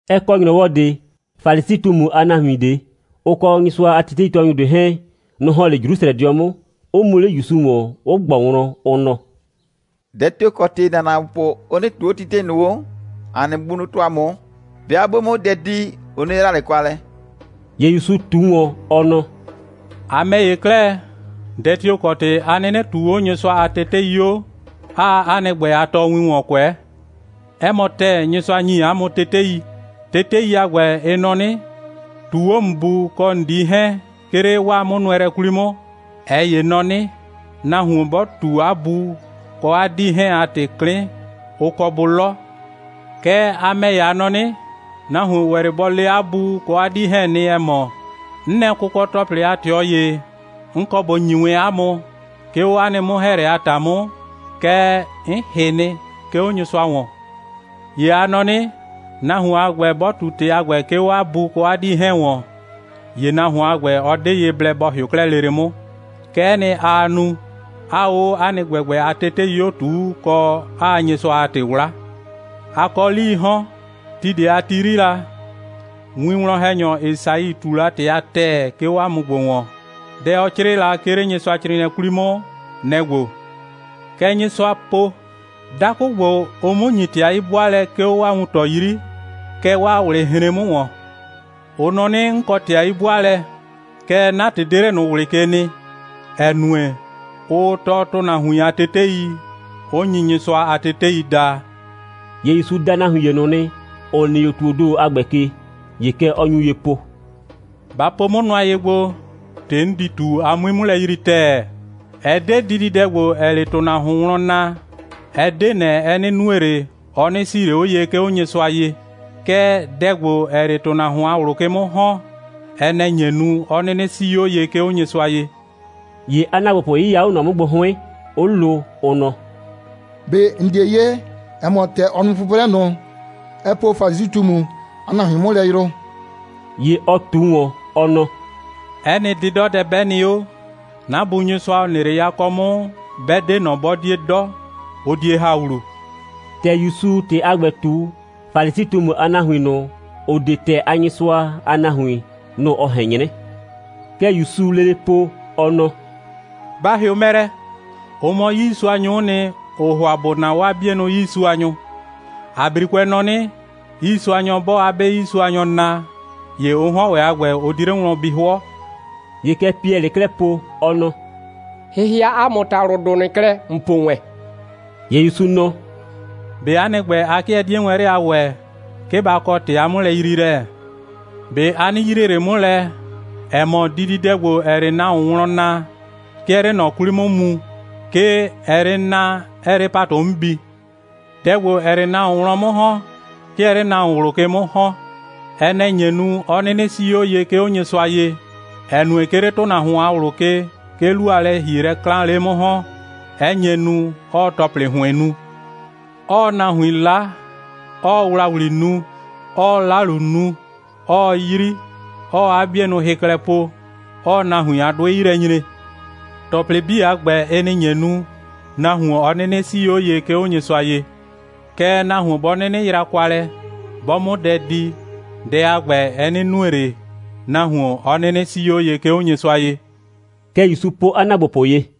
Ɛ kɔ ‑nyrɔwɔ ꞊de, Falisi꞊tumu a nahuin ꞊de, ʋ kɔ Nyɩsʋa a teteitɔɔnyʋ ꞊de 'hɛɛn, nʋ‑ ‑hɔn 'le Jrusrɛdɩɔ 'mʋ, 'ʋ mu 'le ‑Yusu ‑wɔn, 'ʋ ꞊gbɔ wlɔn, ʋ nɔ: «Dɛ tio‑ kɔ ‑tɩ ‑na ‑naagbopʋ 'ʋ 'nɩnɩ ꞊tuu 'o tetei ꞊nʋ 'o, ‑a nɩ bunʋ tɔɔ ‑a mʋ? 'Bɩa 'bʋ 'mʋ dɛ di, ʋ 'nɩ yra ꞊le kwa lɛ.» ‑Ye ‑Yusu ꞊tu ‑wɔn, ɔ nɔ: «A ‑mɛ ‑ye 'klɛɛ, dɛ tio‑ kɔ ‑tɩ 'a 'nɩnɩ ꞊tuu 'o Nyɩsʋa a tetei 'o, 'aa 'a nɩ ‑gbɛ a tɔɔwin ‑wɔn kʋɛ? 'Ɛ mɔ ‑tɛɛ, Nyɩsʋa ‑nyi ‑a mʋ tetei. Tetei a ‑gbɛ, ɩ nɔ 'nɩ: ꞊Tuu 'o ‑n bu kɔ ‑n dii 'hɛɛn, 'ke 'le 'waa 'mʋnʋɛlɛ 'kwli 'mʋ! ꞊Ɛ ‑ye nɔ 'nɩ: Nahuon 'bɔ ꞊tu 'a bu kɔ 'a 'dii 'hɛɛn a ‑tɩ 'klɩn, ʋ kɔ bʋ 'lɔ. Kɛɛ, a ‑mɛ ‑ye, a nɔ 'nɩ: Nahuon ‑wɛ 'le bɔ le 'a bu kɔ 'a 'dii 'hɛɛn nɩ, ‑ɛ mɔ: 'N nɛ kʋkɔ‑tɔplɩ a ꞊tɩɔ ‑ye, 'n kɔ ꞊bo ‑nyi wɛn 'a mʋ, 'ke 'o 'a nɩ 'mʋ‑hɛɛlɛ a ‑ta 'mʋ, kɛɛ, 'n ‑hɩ nɩ, 'ke 'o Nyɩsʋa ‑wɔn. ‑Ye a nɔ 'nɩ: Nahuon a ‑gbɛ, 'bɔ ꞊tu ‑tɩ a ‑gbɛ, 'ke 'o 'a bu kɔ 'a 'dii 'hɛɛn ‑wɔn, ‑ye nahuon a ‑gbɛ, ɔ 'de ye blɛ bɔ ‑hɩʋ 'klɛɛ lele 'mʋ. Kɛ'ɛ nɩ, aa nu, 'aa 'o 'a nɩ ‑gbɛgbɛ a tetei 'o ꞊tuu, kɔ, 'aa Nyɩsʋa a ‑tɩ 'wla. A kɔ 'lii 'hɔn. Ti ꞊de a ti 'yri la, winwlɔn‑hɛnyɔ Esai ꞊tu la ‑tɩ a ‑tɛɛ, 'ke 'o 'a mʋ ‑gbo ‑wɔn. Dɛ, ɔ 'crɩɩ la, 'ke 'le Nyɩsʋacrɩɩnɩɛ 'kwli 'mʋ, nɛ‑ ‑gbo: Kɛ Nyɩsʋa po: Dakʋ ‑gbo, ʋʋ 'mʋ ‑nyi ‑tɩ a 'yi'bʋaalɛ, 'ke 'o 'waa wuntɔ 'yri, kɛɛ, 'waa ꞊wlɩ hren 'mʋ ‑wɔn. Ʋ nɔ 'nɩ, 'n kɔ ‑tɩ a 'yi'bʋaalɛ, kɛɛ, 'na ‑tɩ 'de 'le ꞊nʋ ꞊wlɩ ke nɩ, ‑ɛ nue, ʋʋ tɔɔ ‑tʋnahuin a tetei, 'ʋ nyi Nyɩsʋa a tetei daa.» ‑Ye ‑Yusu da nahuin ‑ye ꞊nʋ nɩ, ‑ʋ nɩ 'o ‑tuoo ‑do a ‑gbɛ ke, ‑ye kɛ ɔ nyu ye po: «Ba po 'mʋ nʋa ye gbo, ‑tɩ 'n di ꞊tu, a 'mui 'mʋ lɛ yrii ‑tɛɛ! Ɛ 'de dididɛ ‑gbo, ‑ɛɛ 'le ‑tʋnahuon wlɔn naa, ɛ 'de ꞊nɛ, ɛ 'nɩ nue ꞊le, ɔ 'nɩ 'sii ꞊le 'o ye, 'ke 'o Nyɩsʋa ye. Kɛɛ, dɛ ‑gbo, ‑ɛɛ 'le ‑tʋnahuon a ꞊wlʋ ke 'mʋ ‑hɔn, ɛ nɛ‑ nye nu, 'ɔ 'nɩnɩ 'sii 'o ye, 'ke 'o Nyɩsʋa ye.» ‑Ye 'a ‑naagbopʋ 'yɩya 'o ꞊nɔ 'mʋ gbo 'hʋɩn, 'ʋ lo, ʋ nɔ: «꞊Be ‑n 'die 'ye, ‑ɛ mɔ, ‑tɛ ‑n nu 'pʋprɛ ꞊nʋ, ɛ po Falisi꞊tumu a nahuin 'mʋ lɛ yrʋ?» ‑Ye ɔ ꞊tu ‑wɔn, ɔ nɔ: «'Ɛ nɩ 'dɩdɔdɛ 'bɛ nɩ 'o, 'na Bu Nyɩsʋa, ‑ɔ nɩ 'le yakɔ 'mʋ, 'bɛ 'de ꞊nɔ, 'bɔ 'die 'dɔ, ʋ die ‑ha ‑wlu.» (‑Tɛ ‑Yusuu ‑tɩ a ‑gbɛ ꞊tu, Falisi꞊tumu a nahuin ꞊nʋ, ‑ʋ 'de ‑tɛɛ a Nyɩsʋa a nahuin, nʋ‑ ɔ ꞊hɛn 'nyrɛ.) Kɛ ‑Yusuu lele po, ɔ nɔ: «Ba ‑hɩʋ mɛ lɛ! Ʋ mɔ 'yiisuanyʋ'ʋ nɩ, ‑ʋʋ ‑hʋa ‑bʋ naa 'waa 'bienʋ 'yiisuanyʋ. ‑A 'brikʋɛ nɔ 'nɩ: 'Yiisuanyɔ 'bɔɔ 'a 'be 'yiisuanyɔ naa, ‑ye ʋ 'hɔn ‑wɛ a ‑gbɛ, ʋ di 'le wlɔn bi 'hʋɔ.» ‑Ye kɛ Piɛlɩɩ 'klɛɛ po, ɔ nɔ: «‑Hɩhɩa ‑a mʋ ‑talʋdʋ ꞊nʋ klɛ, ‑n po wɛn!» ‑Ye ‑Yusu nɔ: «꞊Be 'a nɩ ‑gbɛ, a 'kɩɛ 'die wɛn 'le a ‑wɛɛ, 'ke ba kɔ ‑tɩ a 'mʋlɛyriilɛ? ꞊Be a 'nɩ yrie ꞊le 'mʋ lɛ, ‑ɛ mɔ, dididɛ ‑gbo, ‑ɛɛ 'le nahuon wlɔn naa, 'ke ɛɛ 'le ꞊nɔ 'kwli 'mʋ mu, 'ke ɛɛ 'le naa, 'ɛɛ 'le ‑patʋ 'mʋ bi. Dɛ ‑gbo, ‑ɛɛ 'le nahuon wlɔn 'mʋ ‑hɔn, 'ke ɛɛ 'le nahuon ꞊wlʋ ke 'mʋ ‑hɔn. Ɛ nɛ‑ nye nu, 'ɔ 'nɩnɩ 'sii 'o ye, 'ke 'o Nyɩsʋa ye, ‑ɛ nue, 'ke 'le ‑tʋnahuon a ꞊wlʋ ke, 'ke 'lu a lɛ‑hielɛ 'klaan 'le 'mʋ ‑hɔn, 'ɛ nye nu, 'ɔɔ ‑tɔplɩ ‑hʋɩn nu: 'ɔɔ nahuin 'la, 'ɔɔ ‑wlawli nu, 'ɔɔ 'lalu nu, 'ɔɔ 'yri, 'ɔɔ 'a 'bienʋ hɩ klɛ po, 'ɔɔ nahuin a 'dʋɩ 'yi lɛ nyre. ‑Tɔplɩ 'bii a ‑gbɛ, ɩ nɩ‑ nye nu, nahuon 'ɔ 'nɩnɩ 'sii 'o ye, 'ke 'o Nyɩsʋa ye. Kɛɛ, nahuon 'bɔ 'nɩnɩ yra kwa lɛ, 'bɔ 'mʋ dɛ di, dɛ a ‑gbɛ, ɛ 'nɩ nue ꞊le, nahuon 'ɔ 'nɩnɩ 'sii 'o ye, 'ke 'o Nyɩsʋa ye.» Kɛ ‑Yusu po 'a ‑naagbopʋ ye.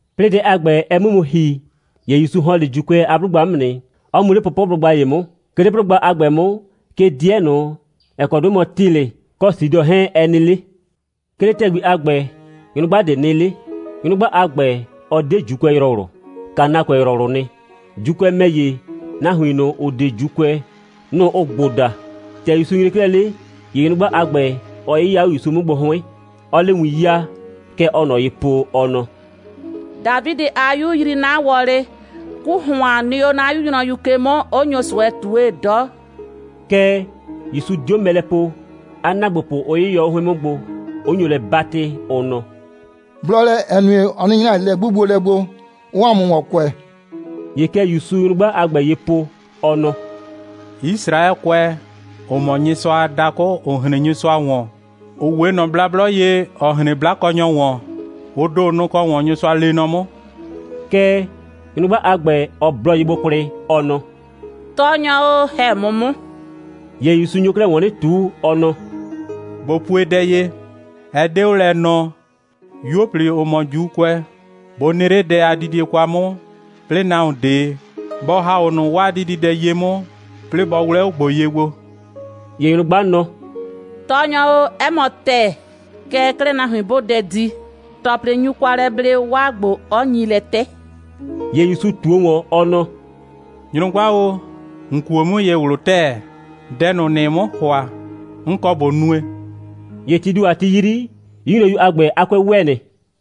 'Plɩɩ dɛ a ‑gbɛ, ɛ 'mʋ mu ‑hi, ‑ye ‑Yusu ‑hɔn 'le ‑Juukʋɛ a 'blʋgba 'mʋ nɩ, 'ɔ mu 'le pʋpʋblʋgba ‑ye 'mʋ. 'Ke 'le 'blʋgba a ‑gbɛ 'mʋ, 'ke 'dɩɛ ꞊nʋ, ‑ɛ kɔ 'dʋɩ mɔ Tilɩ kɔ Sidɔ 'hɛɛn, ɛ nɩ 'le. 'Ke 'le ‑tɛgbi a ‑gbɛ, nyrʋgba ꞊de nɩ 'le. Nyrʋgba a ‑gbɛ, ɔ 'de ‑Juukʋɛyrɔwlʋ. Kanaakʋɛyrɔwlʋʋ nɩ. (‑Juukʋɛ ‑mɛ ‑ye, nahuin ꞊nʋ, ‑ʋ 'de ‑Juukʋɛ, nʋ‑ ʋʋ ‑gbo daa.) ‑Tɛ ‑Yusu nyre 'klɛɛ 'le, ‑ye nyrʋgba a ‑gbɛ, ɔ 'yɩya 'o ‑Yusu 'mʋ gbo 'hʋɩn, 'ɔɔ 'le win 'yaa, kɛ ɔɔ ꞊nɔ ye po, ɔ nɔ: «Dafidɩ a 'Yu! Yrii 'na wɔlɩ. 'Ku ‑hʋan nɩ 'o 'na 'yu nyrɔyu ke 'mʋ, 'ʋ nyo ꞊sʋɛ ꞊tue 'dɔ.» Kɛɛ, ‑Yusu 'dio mɛ lɛ po, 'a ‑naagbopʋ 'ʋ 'yɩyɔ 'o 'hʋɩn 'mʋ gbo, 'ʋ nyo lɛ 'batɩ, ʋ nɔ: «Blɔ lɛ, ‑ɛ nue, ɔ 'nɩ nyra ꞊le lɛ'gbugbolɛ gbo, 'ɔɔ ‑a mʋ ‑wɔn kʋɛ.» ‑Ye kɛ ‑Yusuu nyrʋgba a ‑gbɛ ye po, ɔ nɔ: «Yisraɛkʋɛ, ‑ʋ mɔ Nyɩsʋa a dakʋ, ‑ʋ hren Nyɩsʋa ‑wɔn, ‑ʋ 'we ꞊nɔ blablɔ ye, ‑ɔ hren 'blakɔnyɔ ‑wɔn, ʋ ‑do, nʋ‑ kɔ ‑wɔn Nyɩsʋa lee nɔ 'mʋ.» Kɛɛ, nyrʋgba a ‑gbɛ, ɔ blɔ ye gbo kwlɩ, ɔ nɔ: «Tɔɔnyɔ o, ‑hɛ 'mʋ 'mʋ!» ‑Ye ‑Yusu nyo 'klɛɛ ‑wɔn 'nɩ ꞊tu, ɔ nɔ: «꞊Bo pue dɛ ye: Ɛ 'de 'o lɛ nɔɔ, 'yuo꞊pli, (‑ʋ mɔ ‑Juukʋɛ,) bʋ nɩ 'le dɛ a didie kwa 'mʋ, 'plɩɩ nahuon ꞊de bɔ ‑ha 'o ꞊nʋ 'waa dididɛ ye 'mʋ, 'plɩɩ bɔ 'wlɛ 'o ‑gbo ye gbo.» ‑Ye nyrʋgba nɔ: «Tɔɔnyɔ o, 'ɛ mɔ ‑tɛɛ. Kɛɛ 'klɛɛ, nahuin 'bʋʋ dɛ di, ‑tɔplɩ nyu kwa lɛ ble, 'waa ‑gbo 'ɔ nyi lɛ 'tɛ.» ‑Ye ‑Yusu ꞊tuo ‑wɔn, ɔ nɔ: «Nyrʋgba o, ‑n kuo 'mʋ ye ꞊wlʋ ‑tɛɛ. Dɛ ꞊nʋ, ‑nɩɩ 'mʋ ‑hʋa, 'n kɔ ꞊bo nue.» ‑Ye tii ‑do a ti 'yri, 'yu nyrɔyu a ‑gbɛ a 'kʋɛ ‑wɛ nɩ.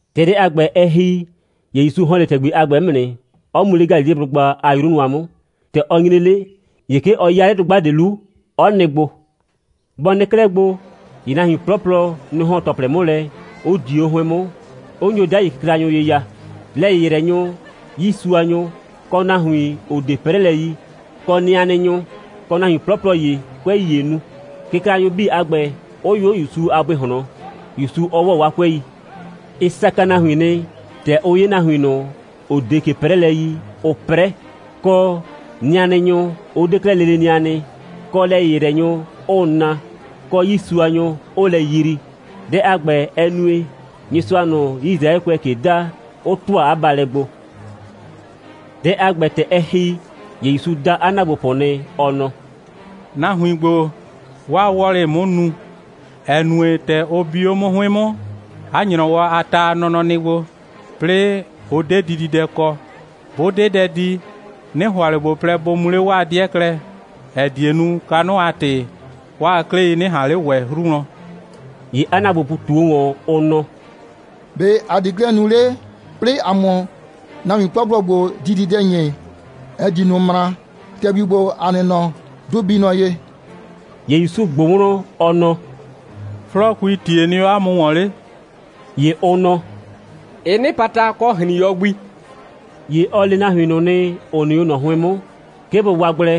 ‑Tɛ dɛ a ‑gbɛ, ɛ ‑hi, ‑ye ‑Yusu ‑hɔn 'le ‑tɛgbi a ‑gbɛ 'mʋ nɩ, 'ɔ mu 'le Galileblʋgba a 'yru nʋa 'mʋ. ‑Tɛ ɔ nyre 'le, ‑ye 'ke ɔ 'ya 'le dʋgba ꞊de 'lu, 'ɔ nɩ gbo. Bɔ nɩ 'klɛɛ gbo, ‑ye nahuin 'plɔplɔ, nʋ‑ ‑hɔn ‑tɔplɩ 'mʋ lɛ, 'ʋ dio 'o 'hʋɩn 'mʋ, 'ʋ nyo 'dai kɩklanyʋ ye ya: lɛ‑yɩyrɛnyʋ, 'yiisuanyʋ, kɔ nahuin, ‑ʋ 'de 'prɛlɛ yi, kɔ nɩanɩnyʋ, kɔ nahuin 'plɔplɔ ‑ye, 'kʋɛi ‑yee nu, kɩklanyʋ 'bii a ‑gbɛ, 'ʋ yʋ 'o ‑Yusu a bʋɩ ꞊hlɔn, ‑Yusu 'ɔ ‑wɔ 'waa 'kʋɛi. Ɩ saka nahuin nɩ, ‑tɛ ʋ 'ye nahuin ꞊nʋ, ‑ʋ 'de ꞊ke 'prɛlɛ yi, 'ʋʋ 'prɛ, kɔ, nɩanɩnyʋ 'ʋ 'de 'klɛɛ lele nɩa nɩ, kɔ, lɛ‑yɩyrɛnyʋ, 'ʋʋ na, kɔ, 'yiisuanyʋ, 'ʋʋ lɛ yrii. Dɛ a ‑gbɛ, ɛ nue, Nyɩsʋa ꞊nʋ, Yisraɛkʋɛɛ ꞊ke da, 'ʋ ‑tʋa 'a baalɛ gbo. Dɛ a ‑gbɛ, ‑tɛ ɛ ‑hi, ‑ye ‑Yusu da 'a ‑naagbopʋ nɩ, ɔ nɔ: «Nahuin ‑gbo, 'waa wɔlɩ‑ɩ 'mʋ nu, ‑ɛ nue, ‑tɛ ʋ bi o mɔ 'mʋ 'hʋɩn 'mʋ, 'a ‑nyrɔwɔ a ta a nɔnɔ nɩ gbo, 'plɩɩ ʋ 'de dididɛ kɔ. 'Bʋ 'de dɛ di, 'nɩ ‑hʋa ꞊le ꞊bo plɛ, bʋ mu 'le 'waa 'dɩɛ klɛ, ‑ɛ die nu, kanʋ a ‑tɩ, 'waa 'klɩi 'nɩ ꞊han 'le ‑wɛ 'hru wlɔn.» ‑Ye 'a ‑naagbopʋ ꞊tuo ‑wɔn, ʋ nɔ: «‑Be' ‑a di 'klɛɛ nu 'le, 'plɩɩ ‑a 'mʋ nahuin 'plɔplɔ ‑gbo dididɛ ‑nyi, ‑ɛ di ꞊nʋ ꞊mraa. ‑Tɛgbi ‑gbo, ‑a nɩ nɔ, 'dʋ bii nɔ ye.» ‑Ye ‑Yusu ꞊gbʋ wlɔn, ɔ nɔ: «'Flɔɔkuii ‑tie nɩ 'o 'a mʋ ‑wɔn 'le?» ‑Ye ʋ nɔ: «Ɩ 'nɩpata, kɔ ‑hrin.yɔ gbi.» ‑Ye ɔ le nahuin ꞊nʋ nɩ, ‑ʋ nɩ 'o ꞊nɔ 'hʋɩn 'mʋ, 'ke bʋ waa gblɛ,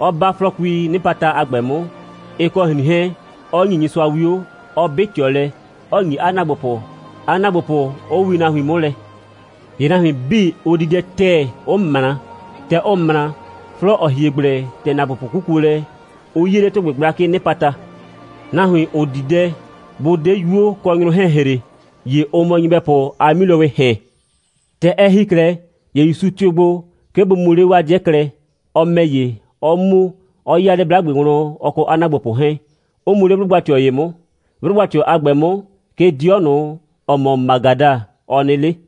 'ɔ 'ba 'flɔɔkuii 'nɩpata a ‑gbɛ 'mʋ, ɩ kɔ ‑hrin 'hɛɛn, 'ɔ ‑nyi Nyɩsʋa 'wio, 'ɔ 'bɩ ꞊tɩɔ lɛ, 'ɔ ‑nyi 'a ‑naagbopʋ, 'a ‑naagbopʋ 'ʋ wii nahuin 'mʋ lɛ. ‑Ye nahuin 'bii, ʋ di dɛ ‑tɛɛ, 'ʋ ꞊mra. ‑Tɛ ʋ ꞊mra, 'flɔɔ, ‑ɔ hie gblɛ, ‑tɛ ‑naagbopʋ 'kukuo lɛ, ʋ 'yie 'le ‑tʋgbɩ gblakɩɩ 'nɩpata. Nahuin, ‑ʋ di dɛ, 'bʋ 'de 'yuo kɔ nyrʋ 'hɛɛn ‑hre, ‑ye ʋ mɔ nyɩbɛpʋ a 'milowɩɩ ‑hɛn. ‑Tɛ ɛ ‑hi 'klɛɛ, ‑ye ‑Yusu tɩʋ gbo, 'ke bʋ mu 'le 'waa 'dɩɛ klɛ, ɔ ‑mɛ ‑ye, 'ɔ mu, 'ɔ 'ya 'le 'blagbe wlɔn, ɔ kɔ 'a ‑naagbopʋ 'hɛɛn, 'ʋ mu 'le 'blʋgba꞊tɩɔ ‑ye 'mʋ. 'Blʋgba꞊tɩɔ a ‑gbɛ 'mʋ, 'ke 'dɩɔ ꞊nʋ, ‑ɔ mɔ Magada, ɔ nɩ 'le.